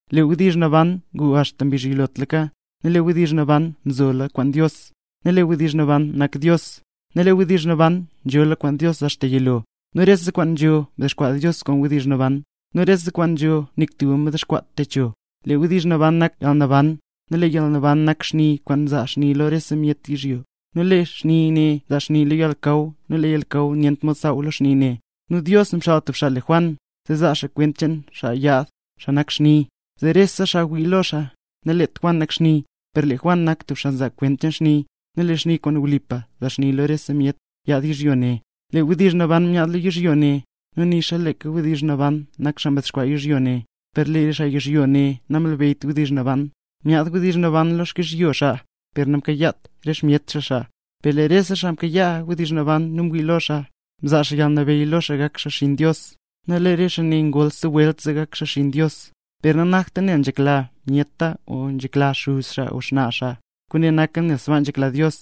Lee Wdizh Naban ngu axta mbizh yilotlaka, nu lee Wdizh Naban nzola kwaan Dios, nu lee Wdizh Naban nak Dios. Nu lee Wdizh Naban nzola kwaan Dios axta yilo. Nu rese kwaan nzho mdexkwaa Dios kwaan Wdizh Naban, nu rese kwaan nzho nik tuba namdexkwaat techo. Lee Wdizh Naban nak yalnaban, nu lee yalnaban nak xni kwaan nzaa xni lo rese myet yizhyo. Nu lee xni ne nzaa xni lo yalnakaw nu lee yalnakaw nyent mod saaw lo xni ne. Nu Dios mxaal tub xaa le Juan, zee zaa xaa kwent cheen xaa yaad, xaa nak xni, zee rese xaa wii lo xaa. Naleet Juan nak xni, per lee Juan nak tub xaa mzaa kwent cheen xni, nu lee xni kwaan wlipa nzaa xni lo rese myet, yaad yizhyo ne. Lee Wdizh Naban myaad lo yizhyo ne, nu nixa leeka Wdizh Naban nak xaa mdexkwaa yizhyo ne, per lee re xaa yizhyo ne namlebeyyt Wdizh Naban. Myaad Wdizh Naban lo xkyizhyo xaa, per namkayaat re xmyet xaa xaa. Per lee rese xaa mkayaa Wdizh Naban nu mwii lo xaa, mzaa xaa yalnabeyy lo xaa gak xaa xinn Dios. Nu lee re xaa ne ngol stub welt zee gak xaa xinn Dios, per nanakta nel nzhekla myeta o nel nzhekla xuz xaa o xnaa xaa, kwaane naka nel sbaa nzhekla Dios.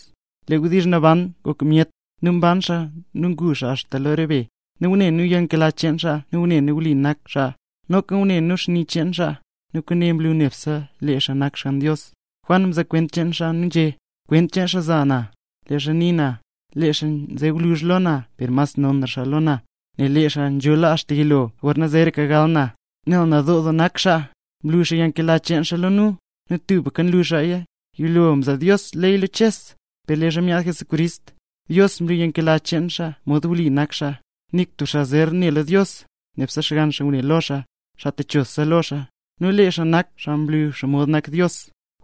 Lee Wdizh Naban ngok myet, nu mban xaa nu ngu xaa lo re be, nu ngune nu yalnkela cheen xaa, nu ngune nu wli nak xaa. Noka ngune nu lo xni cheen xaa, nu kwaane mlu nebse lee xaa nak Xgann Dios. Juan mzaa kwent cheen xaa nu nzhé: —Kwent cheen xaa mza na, leezha ngunii na, lee xaa nze ngwluzh lo na per mas nonra xaa lo na, nel lee xaa nzhola axta yilo gorna zeeraka gal na. Nel nadoo doo nak xaa, mlu xaa yalnkela cheen xaa lo nu, nu tubka nlu xaaya. Yilo mzaa Dios ley lo Ches; per leezha myaad Jesucrist, Dios mlu yalnkela cheen xaa nu mod wli nak xaa. Nik tub xaa zer ne lo Dios; nebse Xgann xaa ngune lo xaa, xaa techosa lo xaa, nu lee xaa nak xaa mlu xomod nak Dios.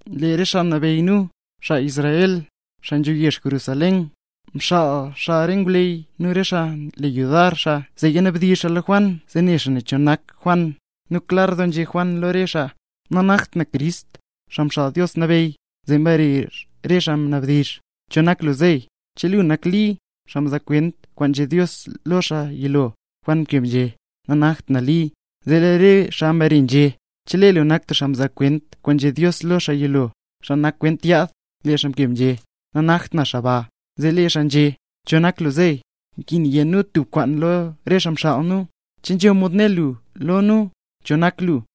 Lee re xaa nabeyy nu, xaa Israel, xaa nzho yezh Jerusalén, mxaal xaa re ngwleyy nu re xaa nle yudar xaa zee yanabdizh xaa lo Juan zee ne xaa cho nak Juan. —Nanakt na Crist, Xaa Mxaal Dios Nabeyy. Zee mbare re xaa mnabdizh: —¿Cho nak lu zeey? ¿Che lu nak Li, xaa mzaa kwent kwaan nzhé Dios lo lee xaa yilo? Juan mkeb nzhé: —Nanakt na Li. Zee lee re xaa mbare nzhé: —¿Che lu nak stub xaa mzaa kwent kwaan nzhé Dios lo lee xaa yilo, xaa nak kwent yaad? Lee xaa mkeb nzhé: —Nanakt na xaa ba. Zee lee re xaa nzhé: —¿Cho nak lu zeey? Nkin yé nu tub kwaan lo re xaa mxaal nu. ¿Che nzho mod né lu lo nu, cho nak lu?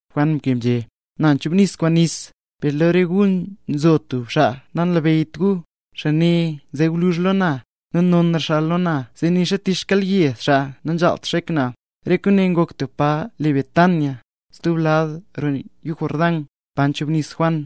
Juan mkeb nzhé: —Na nchubnis kwaan nis, per lo re gu nzho stub xaa nanlabeyyt gu. Xaa ne nze gwluzh lo na, nu nonra xaa lo na zee nixa tich xkyelyed xaa nanzhaalt xek na. Re kwaane ngok tub pa le Betania, stub lad roo yuu Jordán, pa mchubnis Juan.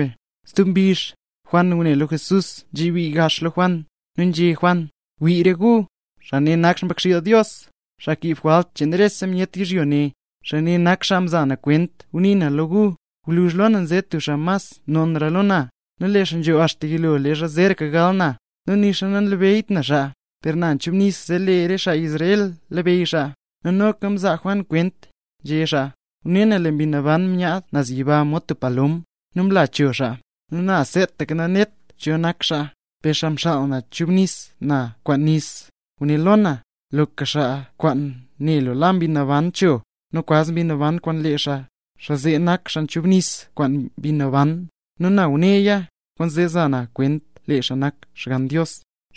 Stub mbizh, Juan ngune lo Jesús mzebii gax lo Juan, zee nzhé Juan: —¡Wii re gu, xaa ne nak Xmbakxiil Dios, xaa kiib jwalt cheen rese myet yizhyo ne! Xaa ne nak xaa mza na kwent leezha ngunii na lo gu: “Gwluzh lo na nze stub xaa mas nonra lo na, nel lee xaa nzho axta yilo leezha zeeraka gal na”. Nu nixa nanlabeyyt na xaa, per na nchubnis zee lee re xaa Israel labeyy xaa. Nu noka mzaa Juan kwent, nzhé xaa: —Ngune na lee Mbi Naban nyaad naz yiba mod tub palom, nu mlaya cho xaa. Nu na seetaka nanet na cho nak xaa, per xaa mxaal na zee chubnis na kwaan nis, nguné lo na: “Loka xaa kwaan ne lu la Mbi Naban cho, nu kwaz Mbi Naban kwaan lee xaa, xaa zee nak xaa chubnis kwaan Mbi Naban”. Nu na nguneya, kwaanzee nza na kwent lee xaa nak Xgann Dios.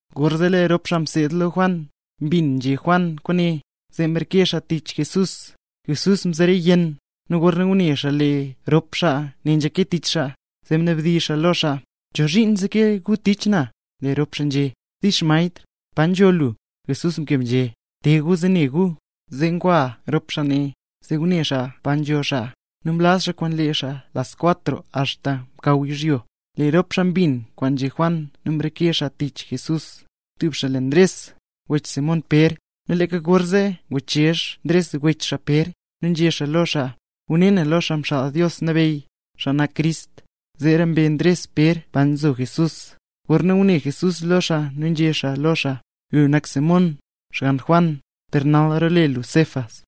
Gorzee lee rop xaa mseed lo Juan, mbin nzhé Juan kwaane, zee mreke xaa tich Jesús. Jesús mzere yenn; nu gorna ngune xaa lee rop xaa ne nzeke tich xaa, zee mnabdizh xaa lo xaa: —¿Chozhiin nzeke gu tich na? Lee rop xaa nzhé: —Dix Maestr, ¿pa nzho lu? Jesús mkeb nzhé: —Te gu zee ne gu. Zee ngwa rop xaa ne, zee ngune xaa pa nzho xaa, nu mlaz xaa kwaan lee xaa las cuatro axta mkaw yizhyo. Lee rop xaa mbin kwaan nzhé Juan nu mreke xaa tich Jesús, tub xaa le Ndres, wech Simón Pér. Nu leeka gorzee nguchezh Ndres wech xaa Pér, nu nzhé xaa lo xaa: —Ngune nu lo Xaa Mxaal Dios Nabeyy, xaa nak Crist. Zeera mbe Ndres Pér pa nzo Jesús, gorna ngune Jesús lo xaa nu nzhé xaa lo xaa: —Lu nak Simón, xgann Juan, per nal role lu Cefas.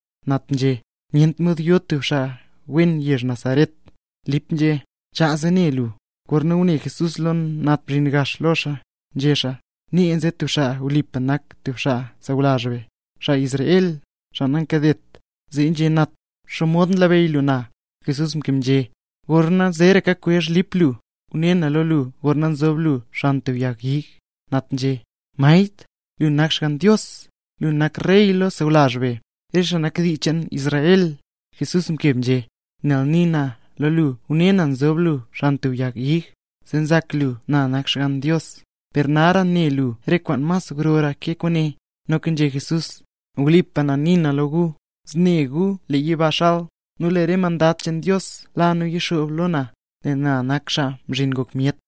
Nat nzhé: —¡Nyent mod yo tub xaa wen yezh Nazaret! Lip nzhé: —Chaa, zee ne lu. Gorna ngune Jesús lee Nat mzhin gax lo xaa, nzhé xaa: —Nee nze tub xaa wlipa nak tub xaa sawlazh be, xaa Israel, xaa nankadet. Zee nzhé Nat: —¿Xomod nlabeyy lu na? Jesús mkeb nzhé: —Gorna zeeraka kwezh Lip lu, ngune na lo lu gorna nzob lu xan tub yag ig. Nat nzhé: —Maestr, ¡lu nak Xgann Dios, lu nak rey lo sawlazh be, re xaa nak dii cheen Israel! Jesús mkeb nzhé: —Nel nii na lo lu ngune na nzob lu xan tub yag ig, zee nzak lu na nak Xgann Dios. Per nara ne lu re kwaan mas grora ke kwaane. Noka nzhé Jesús: —Wlipa na nii na lo gu, zne gu lee yiba xal, nu lee re mandad cheen Dios la nu yixoob lo na; nel na nak Xaa Mzhin Ngok Myet.